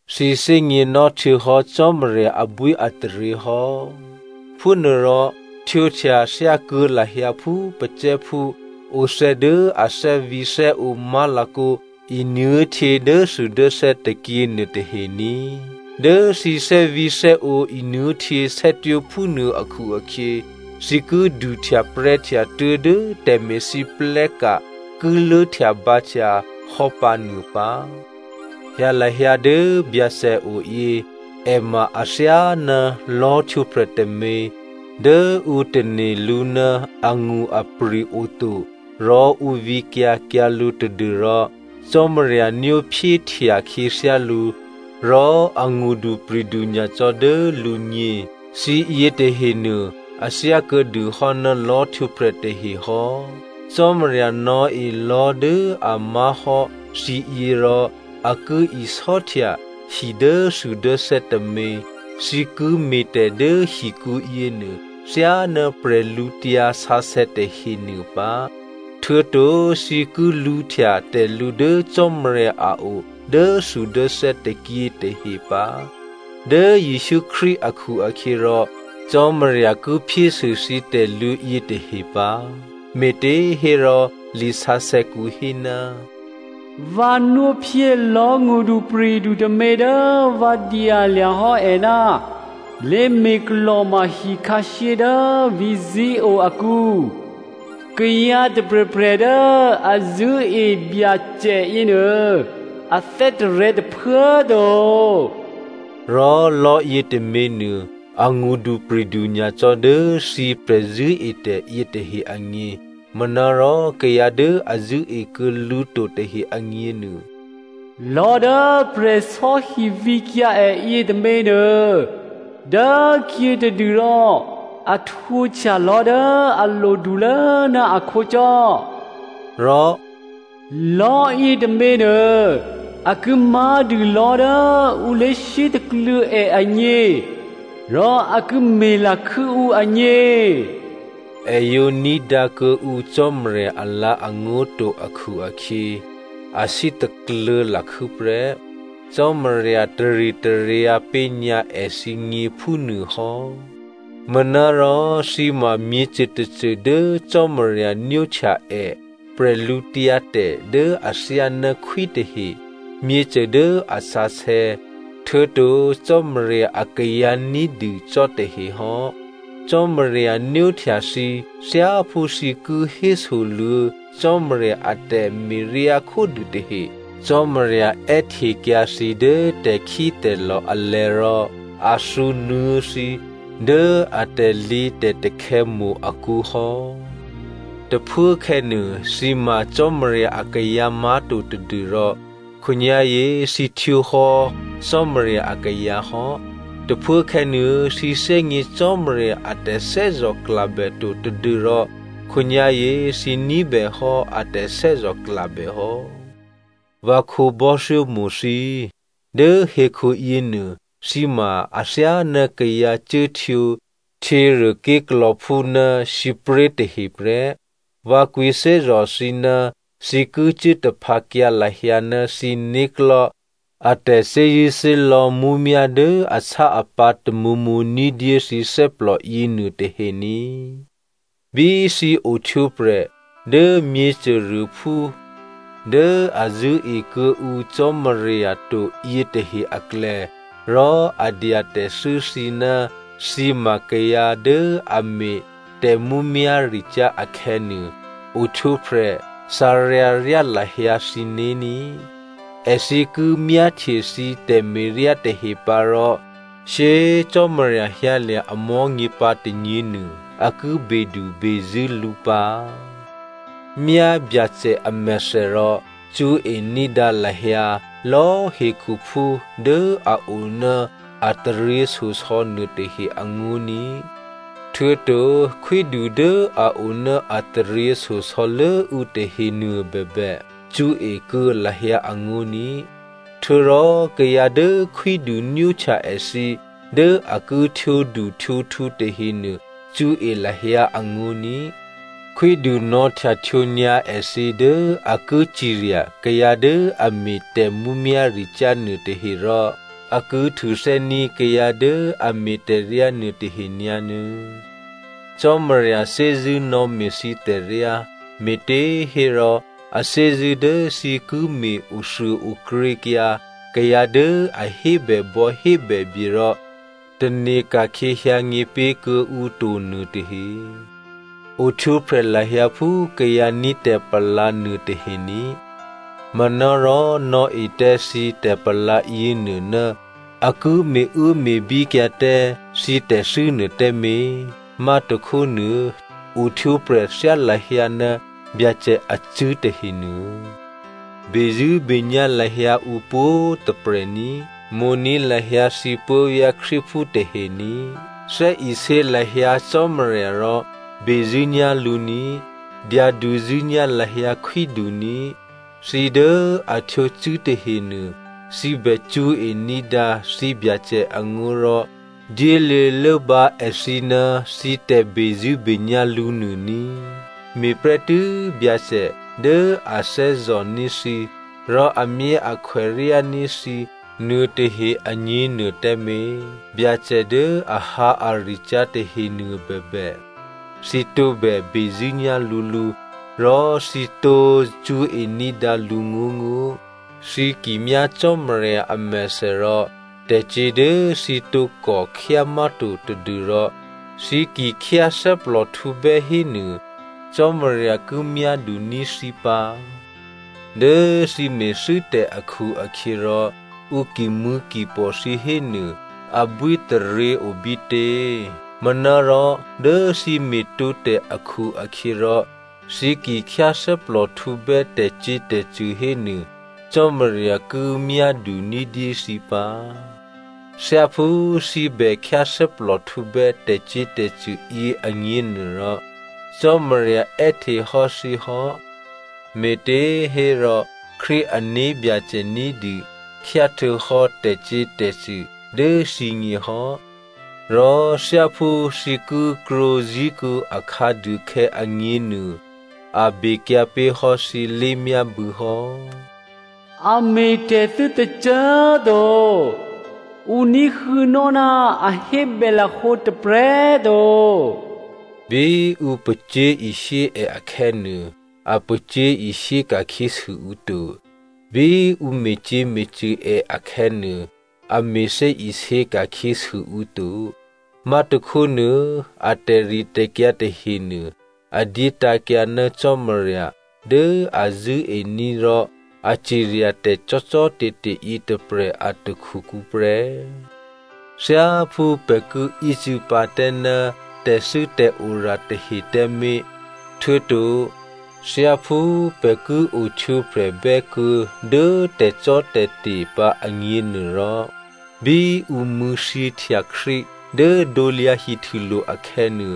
Thǐ thè́gněnò́ htuô̌hò́ Cò́marya abwíataryě hò́. Phúnuôrò htwǒhtya thyákuô̌ lahyǎ phú pacè̤̌phú othè̌ dố a thè́vǐ̤thè́ǒ má̤lakǒ nuô̤htyě dốthudốthè́ tôkyě nuôtahe ní꤮. Dố thǐ thè́vǐ̤thè́ǒ nuô̤htyě sè́twó̤ phúnuô akhu-akhyě, thǐ ki duhtyaprè̤́htya tuố̤dố tè̤me̤lwóhteka̤ ki lốhtyabǎhtya hò́pǎ nuô pǎ. Hyǎ lahyǎ dố Byacè oyě, è ma athyáná lò̤́htwǒprè̤ tômě dố ǔ tane̤ lǔ ná angṳ-apri̤ oto, rò ǔ vǐkyǎ kyǎ lǔ tadû́rò Cò́marya nwóphyéhtya khyěthyá lǔ rò angṳdupri̤du nyacò́ dố lǔgně. Thǐ yětahenuô a thyá kuô̌dûhò́ ná lò̤́htwǒprè̤ tahe hò́. Cò́marya nò̌e lò̤́ dố a má̤hò́ thǐyě rò a ki isò́htya hi dốthudốthè́ tômě. Thǐ ki me̤tè̤ dố hikǔ yěnuô thyáná prè̤lǔtyǎ sǎsè̌ tahenuô pǎ, htuô̌to thǐ ki lǔhtya tè̤lǔ dố Cò́marya a o dốthudốthè́ tôkyě tahe pǎ. Dố Jesǔ Krístu akhu-akhyěrò Cò́marya ki phyésû thǐ tè̤lǔ yětahe pǎ. Me̤těhérò lisǎsè̌kǔ hé, “Vǎ nwóphyé lò̤́ ngṳdupri̤du tômě dố vǎ dyalya̤ hò́ è ná lé̤me̤klò̤ma hikhǎshyé dố vǐ̤ Zion akǔ. Kayǎ tôprè̤prè̤ dố a zṳ̂́e Byacè yěnuô a thè́tarè̤̌ tôphuố꤮ to.” Rò lò̤́ yětôměnuô, angṳdupri̤du nyacò́ dố thǐ prè̤zṳ̂́etè̤ yětahe agně. Manárò kayǎ dố a zṳ̂́ekuô̌ lǔ to tahe agněnuô: “Lò̤́ dố prè̤sò́hi vǐkyǎ è yětômě nuô, dốkhyětadû rò a htwǒhtya lò̤́ dố a lodulố ná akhǒcò́.” Rò “Lò̤́yě tôměnuô a ki má̤dû lò̤́ dố ǔ lé̤sítakluô̌ è agně, rò a ki me̤lakhû́ ǔ agně.” È yǒ ní̤dǎ kuô̌ǔ Cò́marya alǎ̤angó̤ to akhu-akhyě, a sítakluô̌ lakhû́ prè́. Cò́marya taritaryǎ pé̤nyǎ èthǐgně phúnuôhò́. Manárò thǐ ma myěcô tôcô dố Cò́marya nwóhtya è, bwídu dố athyáná khwí tahe, myěcô dố a sǎsè̌, htuô̌to Cò́marya akayǎ ní̤dû cò́ tahe hò́. Cò́marya nwóhtya thǐ thyáphú thǐ ki hésoluô̌ Cò́marya a tè̤me̤ryá khódû tahe. Cò́marya è́htekyǎ thǐ dố tè̤khítè̤lò̤ alè̤̌ rò a thǔnuô̌ thǐ dố a tè̤lǐtè̤takhè̌ mo̤ akǔ hò́. Tôphuốkhè̌nuô, thǐ ma Cò́marya akayǎ má̤to tadû́rò khǒnyá̤yě thǐ htwǒhò́ Cò́marya akayǎ hò́. Tôphuốkhè̌nuô, thǐ thè́gně Cò́marya a tè̤thè́zò̤klabè to tadû́rò khǒnyá̤yě thǐ ní̤bèhò́ a tè̤thè́zò̤klabè hò́. Vǎ khǒbò́thyómo̤ thǐ꤮, dố hekhuyěnuô thǐ ma athyáná kayǎ cuốhtwǒ htyěruôké̤klò̌phú ná sǐpré̤ tahe prè́. Vǎ kwǐthè́zò̤ thǐ ná thǐ ki cuố taphǎkyǎ lahyǎ ná thǐ né̤klò̤́ a tè̤thè́zṳ̂́thè́lò̌ mǔmyá̤ dố asá-apǎ̤ tamǒmǒ ní̤dyé thǐ thè́plò yěnuôtahe ní꤮. Bí thǐ ohtwǒprè̤ dố myěcôruôphú dố a zṳ̂́e kuô̌ǔ Cò́marya to yětahe aklè̌, rò a dya tè̤thû́ thǐ ná thǐ ma kayǎ dố a me̤ tè̤mǔmyá̤ricyá̤ akhè̌nuô, ohtwǒprè̤ thǎryǎ ryá lahyǎ thǐné̤ ní꤮. Èthǐ ki myáhtye thǐ tè̤me̤ryá tahe pǎ rò shyé꤮ Cò́marya hyǎlya̤ amò̤́nyě pǎ tônyěnuô, a ki bedubezṳ̂́ lǔ pǎ. Myá Byacè amèthè rò cṳ̌e ní̤dǎ lahyǎ lò̌꤮ hekhuphú dố a o ná a taryěshyosò̌ nuôtahe angó̤ ní꤮. Htuô̌to khwídu dố a o ná a taryěshyosò̌ lốǔ tahenuô bèbè cṳ̌e kuô̌ lahyǎ angó̤ní꤮. Htuô̌rò kayǎ dố khwídu nwóhtya èthǐ dố a ki htwǒduhtwǒkhu tahenuô cṳ̌e lahyǎ angó̤ ní꤮. Khwídu nò̌htyahtwǒ nyǎ èthǐ dố a ki cirya kayǎ dố a me̤ tè̤mǔmyá̤ricyá̤ nuôtahe rò a ki htuthè́ní̤ kayǎ dố a me̤ tè̤ryá nuôtahe nyǎnuô̌. Cò́marya thè́zṳ̂́ nò̌me̤ thǐ tè̤ryá, me̤těhérò a thè́zṳ̂́ dố thǐ ki me̤ othuôokrěkyǎ kayǎ dố a hébèbò̌ hébèbye rò tane̤ ka̤khyě hyǎnyě pé̤ kuô̌ǔ to nuôtahe. Ohtwǒprè̤ lahyǎ phú kayǎ ní̤ tè̤palǎ nuôtahe ní꤮. Manárò nò̌e tǎ thǐ tè̤palǎ yěnuô ná a ki me̤uốme̤bíkyǎ tǎ thǐ tè̤thû́nuô tǎmé̤. Má̤tôkhónuô ohtwǒprè̤ thyá lahyǎ ná Byacè acṳ̂́ tahenuô. Bezṳ̂́benyá̤ lahyǎ ǔ pwǒ̤꤮ tôprè̤ ní꤮. Mo̤ní̤ lahyǎ thǐ puố̤vyá̤ Krístuphú tahe ní꤮. Thè́isě lahyǎ Cò́marya rò bezṳ̂́nyá̤ lǔ ní꤮. Dyaduzṳ̂́nyá̤ lahyǎ khwídu ní꤮. Thǐ dố a htwǒ cṳ̂́ tahenuô, thǐ bè cṳ̌e ní̤dǎ thǐbyacè angó̤ rò dyéluô̌ lốbǎ èthǐ ná thǐ tè̤bezṳ̂́benyá̤ lǔ nuô ní꤮. Me̤prè́tû́ Byacè dố a thè́zò̤ní̤ thǐ rò amyáakhwèryání̤ thǐ nuôtahe agněnuô tǎmé̤, Byacè dố ahǎaricyá̤ tahenuô bèbè, thǐ tǒbè bezṳ̂́nyá̤ lǔlǔ, rò thǐ tǒ cṳ̌e ní̤dǎ lǔngó̤ngó̤. Thǐ ki myá Cò́marya amèthè rò tè̤cyě̤ dố thǐ tǒkò khyá má̤to tadû́rò thǐ ki khyáthè́plòhtǔbè́ hénuô Cò́marya ki myáduní̤ thǐ pǎ. Dố thǐ me̤thû́tè̤ akhu-akhyěrò ǔ kimṳ̂̌kipò̤ thǐ hénuô, abwítaryě obítě? Manárò dố thǐ me̤tǒtè̤ akhu-akhyěrò thǐ ki khyáthè́plòhtǔbè́ tè̤cyě̤tè̤cṳ̂ hénuô, Cò́marya ki myádu ní̤dyé thǐ pǎ. Thyáphú thǐ bè khyáthè́plòhtǔbè́ tè̤cyě̤tè̤cṳ̂ yě agněnuôrò, Cò́marya è́hte hò́ thǐ hò́, me̤těhérò Krístu ané̤byacè ní̤dû khyá htuô̌hò́ tè̤cyě̤tè̤cṳ̂ dố thǐgně hò́ rò thyáphú thǐ ki krwǒ zí̤kuô̌ akhǎduôkhè̌ agněnuô, a bekyǎ pé̤ hò́ thǐ lé̤myábû̌ hò́. “A me̤ tè̤thû́ tôcô꤮ to. Ǔ ní̤huô̌nò́ ná a hébè lahǒ tôprè̤꤮ to.” Bí ǔ pacyé̤ishyé è akhè̌nuô, a pacyé̤ishyé ka̤khyěsû ǔ to. Bí ǔ me̤cyě̤me̤cṳ̂ è akhè̌nuô, a me̤thè́isě ka̤khyěsû ǔ to. Má̤tôkhónuô a tè̤ritè̤kyǎ tahenuô, a dyétǎ̤kyǎ ná Cò́marya dố a zṳ̂́ení̤ rò a ciryatè̤ cò́cò́te̤te̤ yětôprè̤ a takhukǔ prè́. Thyáphú pè̤ ki ícû̌pǎ tǎ ná tè̤thû́tè̤ora tahe tǎmé̤, htuô̌to thyáphú pè̤ ki ohtwǒprè̤bè́ kuô̌ dố tè̤cò́tè̤te̤ pǎ agněnuôrò, bí ǔ mṳ̂̌thyěhtya Krístu dố krusulo̤ akhè̌nuô,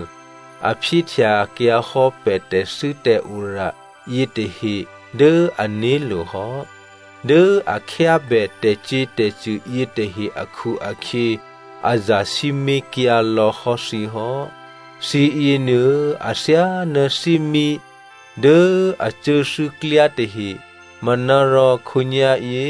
a phyéhtyakyǎhò́ pè̤ tè̤thû́tè̤ora yětahe dố ané̤lo̤ hò́. Dố a khyábè tè̤cyě̤tè̤cṳ̂ yětahe akhu-akhyě a zasǐmé̤kyǎ lò̌hò́ thǐ hò́. Thǐ yěnuô, athyáná thímí dố a cuốthû́klyá tahe. Manárò khǒnyá̤yě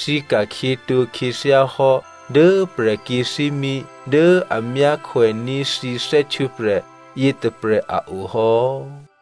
thǐ ka̤khyětǒ khyěthyá hò́ dố prè̤kyě̤ thímí dố a myákhwèní̤ thǐ thè́htwǒprè̤ yětôprè̤ a o hò́.